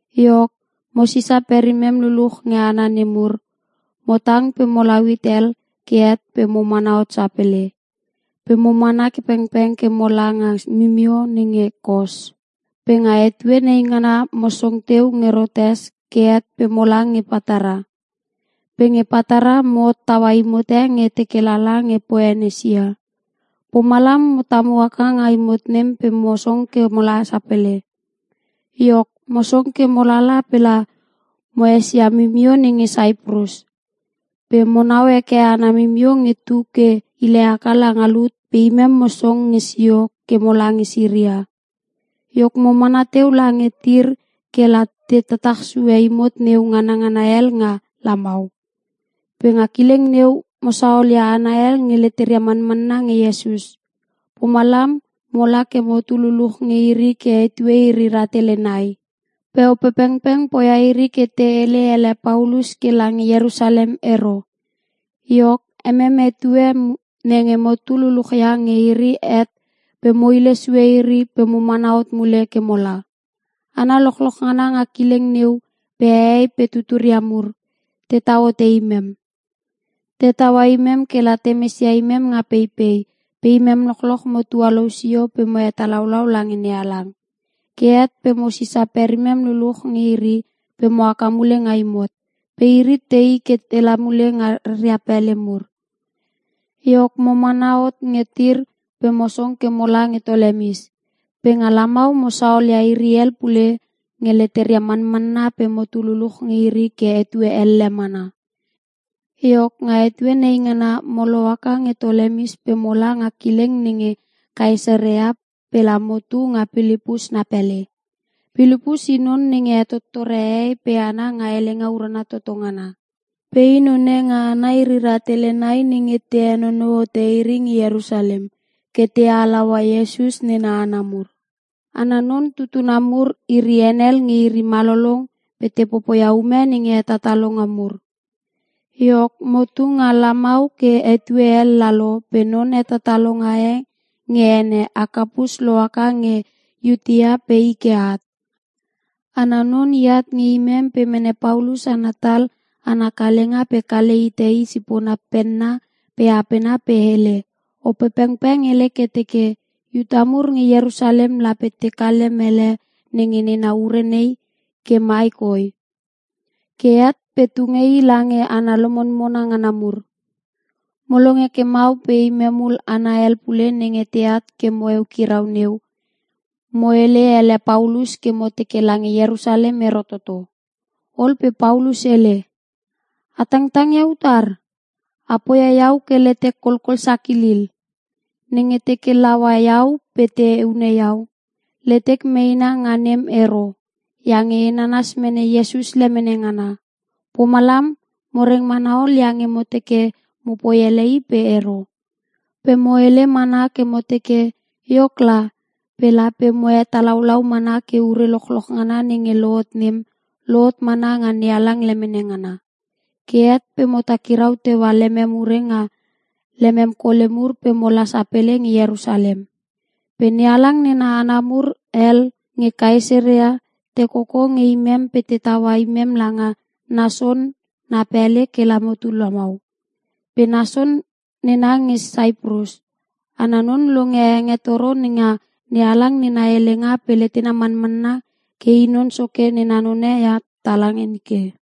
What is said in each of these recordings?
Iok, mo sisa perimem luluch nge hana nemur, mo tang pe molau hit hel ke het pe mo mana hot sapele, pe mo mana pengpeng ke mola nga mimio nenge Kos. Pe nga etue naingana mo song teu nge Rotes ke het pe mola nge Patara. Pe nge Patara mo hottaua imot e nge teke lala nge Poenisia, pomalam mo tamu haka nga imot nem pe mo song ke mola sapele. Iok, mo song ke mo lala pela mo esia mimio nenge Saiprus. Pe monau heke ana mimio nge tu ke ile haka langa lut pe imem mo song nge sio ke mola nge Siria. Iok mo mana teu lange Tir kela te tatach sue imot neu nganngana hel nga lamau. Pe nga kileng neu mo saolia hana hel nge leteria manmanna nge Iesus, pomalam mola ke motu luluch nge iri ke etue iri rahtele nai. Pe Opepengpeng poia iri ke te hele ele Paulus ke lange Ierusalem ero. Iok, emem etue nenge motu luluchia nge iri het pe mo hile sue iri pe mo mana hot mule ke mola. Hana lochloch ngana nga kileng neu pe hehei pe tuturia mur, tetau hote imem. Te taua imem kela te mesia imem nga peipei, pe imem lochloch mo tualou sio pe mo hetalaulau lange NeHalang. Ke het pe mo sisa perimem luluch nge iri pe mo haka mule nga imot, pe iri tei ke tela mule nga ria pele mur. Iok mo mana hot nge Tir pe mo song ke mola nge Tolemis. Pe nga lamau mo saolia iri hel pule nge leteria manmanna pe motu luluch nge iri ke etue elle mana. Iok nga etue nei ngana mo lohaka nge Tolemis pe mola nga kileng nenge Kaesarea pela motu nga Pilipus na pele. Pilipus i non nenge hetottore hehei pe hana nga Helenga Urana Toto Ngana. Pe i none nga hana iri rahtele nai nenge te henonou hote iri nge Ierusalem, ke te halaua Iesus nena hana mur. Ana non tutuna mur iri henel nge iri malolong pe te popoia ume nenge hetatalonga mur. Iok, motu nga lamau ke etue hel lalo pe non hetatalonga e nge ene Akapus lohaka nge Iutea pe i ke at. Ana non iat nge imem pe mene Paulus ana tal ana kalenga pe kale hite i sipona penna pe apena pe hele, “Opepengpeng hele ke teke, ‘Iuta mur nge Ierusalem lape tekale mele nenge nena ure nei ke mai koi. Ke het pe te tunge i lange hana lomonmona ngana mur!’” Mo longe ke mau pe imem hul hana hel pule nenge teat ke mo eukirau neu, mo hele ele Paulus ke mo teke lange Ierusalem ero toto. Ol pe Paulus hele, “A tangtang ia utar? A poia iau ke letek kolkol sakilil. Nenge teke te laua iau pe te hune iau, letek meina nga nem ero, iange e nanas mene Iesus lemene ngana.” Pomalam mo reng mana ol iange mo teke mopoi ele i pe ero. Pe mo hele mana ke mo teke, “Iok la, pe lape mo hetalaulau mana ke ure lochloch ngana nenge lohot nem, lohot mana nga NeHalang lemene ngana.” Ke het pe mo takirau teua lemem ure nga lemem kole mur pe mola sapele nge Ierusalem. Pe NeHalang nena hana mur hel nge Kaesarea, te koko nge imem pe te taua imem langa Nason na pele kela motu lamau. Pe Nason nena nge Saiprus. Ana non longe hengetoro nenga NeHalang nena helenga pe letena manmanna ke i Non Soke nena none ia tala nike.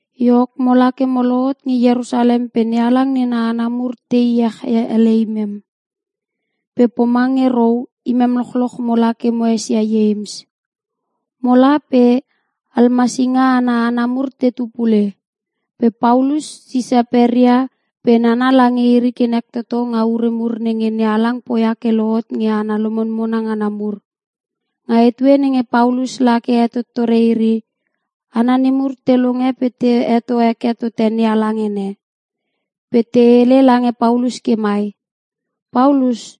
Iok mola ke mo lohot nge Ierusalem pe NeHalang nena hana mur te iech ele imem. Pe pomange rou imem lochloch mola ke mo esia Ieims. Mola pe almasinga ana hana mur tetu pule. Pe Paulus sise peria pe nana lange iri ke nek toto nga ure mur nenge NeHalang poia ke lohot nge hana lomonmona ngana mur, nga etue nenge Paulus la ke hetottore iri. Hana nemur te longe pe te heto heke tote NeHalang ene. Pe te hele lange Paulus ke mai, “Paulus,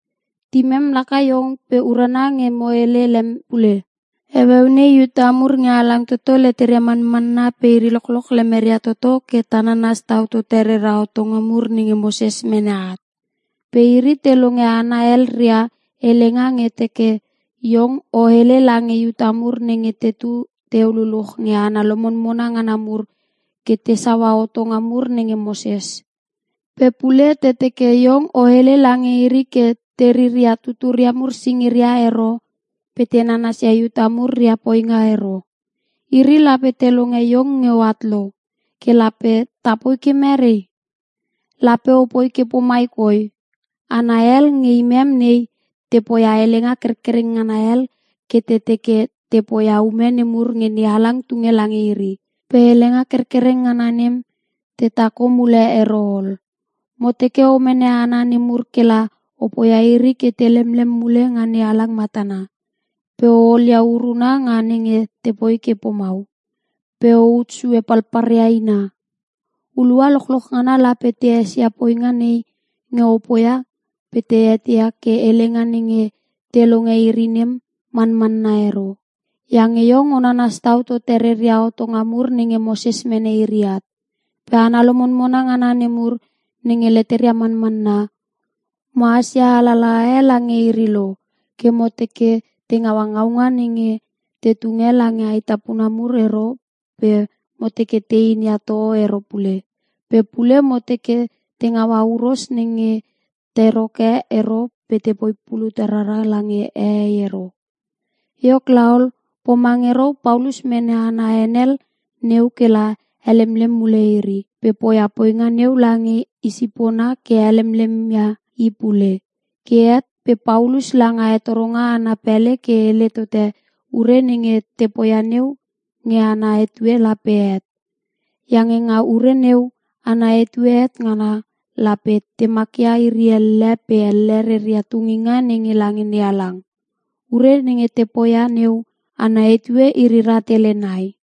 timem laka iong pe urana nge mo hele lem pule. Heueu nei Iuta mur nge halang toto leteria manmanna pe iri lochloch lemeria toto ke ta nanas tau tote rera hotonga mur nenge Moses mene at. Pe iri te longe hana hel ria helenga nge te teke iong o hele lange Iuta mur nenge tetu teu luluch nge hana lomonmona ngana mur ke tesaua hotonga mur nenge Moses. Pe pule te teke iong o hele lange iri ke te riria tuturia mur singiria ero pe te nanasia Iuta mur ria poinga ero. Iri lape te longe iong nge oat lo. Ke lape tapoi ke mere? Lape o poi ke pomai koi: Hana hel nge imem nei te poia helenga kerkereng ngana hel ke te teke te poia ume nemur nenge NeHalang tunge lange iri. Pe helenga kerkereng ngana nem te takho mule ero ol. Mo teke o mene hana nemur kela o poia iri ke te lemlem mule nga NeHalang matana. Pe o olia uruna nga nenge tepoi ke pomau. Pe o ut sue palpalria ina. Hulua lochloch ngana lape te esia poinga nei nge o poia pe te eteia ke helenga nenge te longe iri nem, manmanna ero. Iange iong o nanas tau tote reria hotonga mur nenge Moses mene iri at. Pe hana lomonmona ngana nemur nenge leteria manmanna, mohas ia alalaha e lange iri lo, ke mo teke te ngaua ngaunga nenge te tunge lange ae tapuna mur ero pe mo teke te inia toho ero pule. Pe pule mo teke te ngaua huros nenge teroke ero pe tepoi pulut rara lange hehei ero.” Iok laol, pomange rou Paulus mene hana henel neu kela helemlem mule iri. Pe poia poinga neu lange i sipona ke helemlemia i pule. Ke het pe Paulus langa hetoronga ana pele ke hele tote ure nenge te poia neu nge ana etue lape het. Iange nga ure neu ana etue het ngana, lape te makia iri elle pe elle reria tunginga nenge lange NeHalang. (Ure nenge te poia neu ana etue iri rahtele nai.)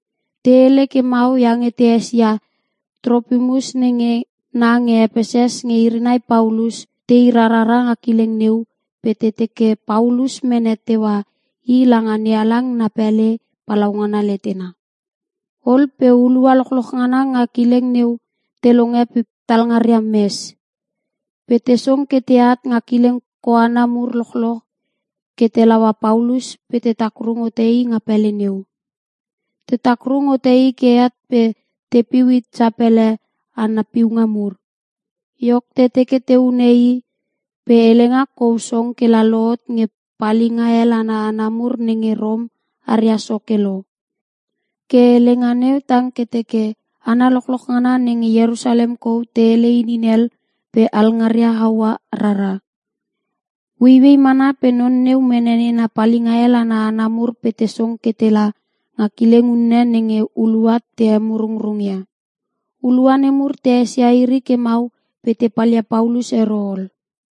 (Te hele ke mau iange te esia Tropimus nenge na nge Epeses nge iri nai Paulus te i rarara nga kileng neu pe te teke Paulus mene teua i langa NeHalang na pele palaungana letena.) Ol pe hulua lochloch ngana nga kileng neu te longe pe talngaria mes. Pe te song ke teat nga kileng koana mur lochoch ke te laua Paulus pe te takrung hote i nga pele neu. Te takrung hote i ke het pe tepiu hit sapele ana piunga mur. Iok te teke te hune i, pe helenga kou song ke la lohot nge palinga hel ana hana mur nenge Rom aria soke lo. Ke helenga neu tang ke teke, “Hana lochloch ngana nenge Ierusalem kou te hele inin hel pe alngaria haua rara.” Ueiuei mana pe non neu mene nena palinga hel ana hana mur pe te song ke tela nga kileng unne nenge hulua te emurungrung ia. Hulua nemur te esia iri ke mau pe te palia Paulus ero ol.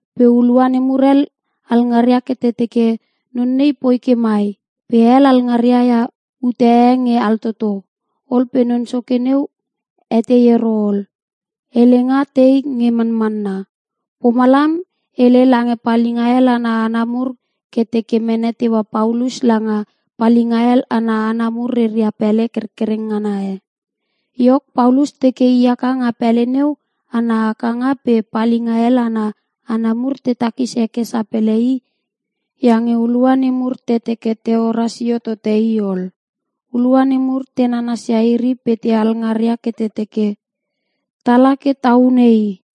Pe hulua nemur hel alngaria ke te teke non nei poi ke mai, pe hel alngaria ia ute e nge altoto. Ol pe non soke neu etei ero ol, helenga tei nge manmanna. Pomalam hele lange palinga hel ana hana mur ke te mene teua Paulus langa palinga hel ana hana mur reria pele kerkereng ngana e. Iok Paulus teke i haka nga pele neu ana hakanga pe palinga hel ana hana mur te takis heke sapele i iange hulua nemur te teke teora sio tote i ol. Hulua nemur te nanasia iri pe te alngarngaria ke te teke, “Tala ke ta hune i!”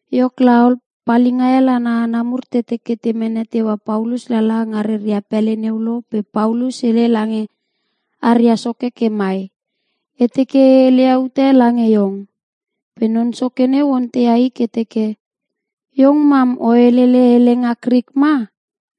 Iok laol, palinga hel ana hana mur te teke te mene teua Paulus lala nga reria pele neu lo pe Paulus hele lange aria soke ke mai, “E teke e heleia ute lange iong.” Pe non soke neu onteia i ke teke, “Iong mam o helele helenga Krik ma?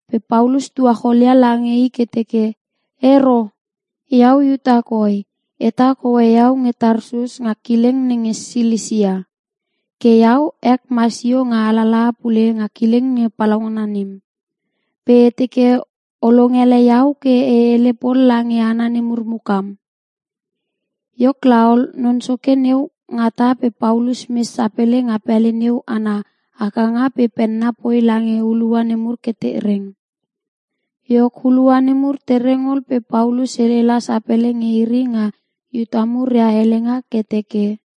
Pe Paulus tuacholia lange i ke teke, “Ero! Iau Iuta koi, etak hoe iau nge Tarsus nga kileng nenge Silisia. Ke iau ek masio nga alalaha pule nga kileng palaungana nem. Pe e teke o longele iau ke e hele pol lange hana nemur mukam.” Iok laol, non soke neu ngata pe Paulus mes sapele nga pele neu ana hakanga pe penna poi lange hulua nemur ke te reng. Iok hulua nemur tereng ol pe Paulus hele la sapele nge iri nga Iuta mur ria helenga ke teke,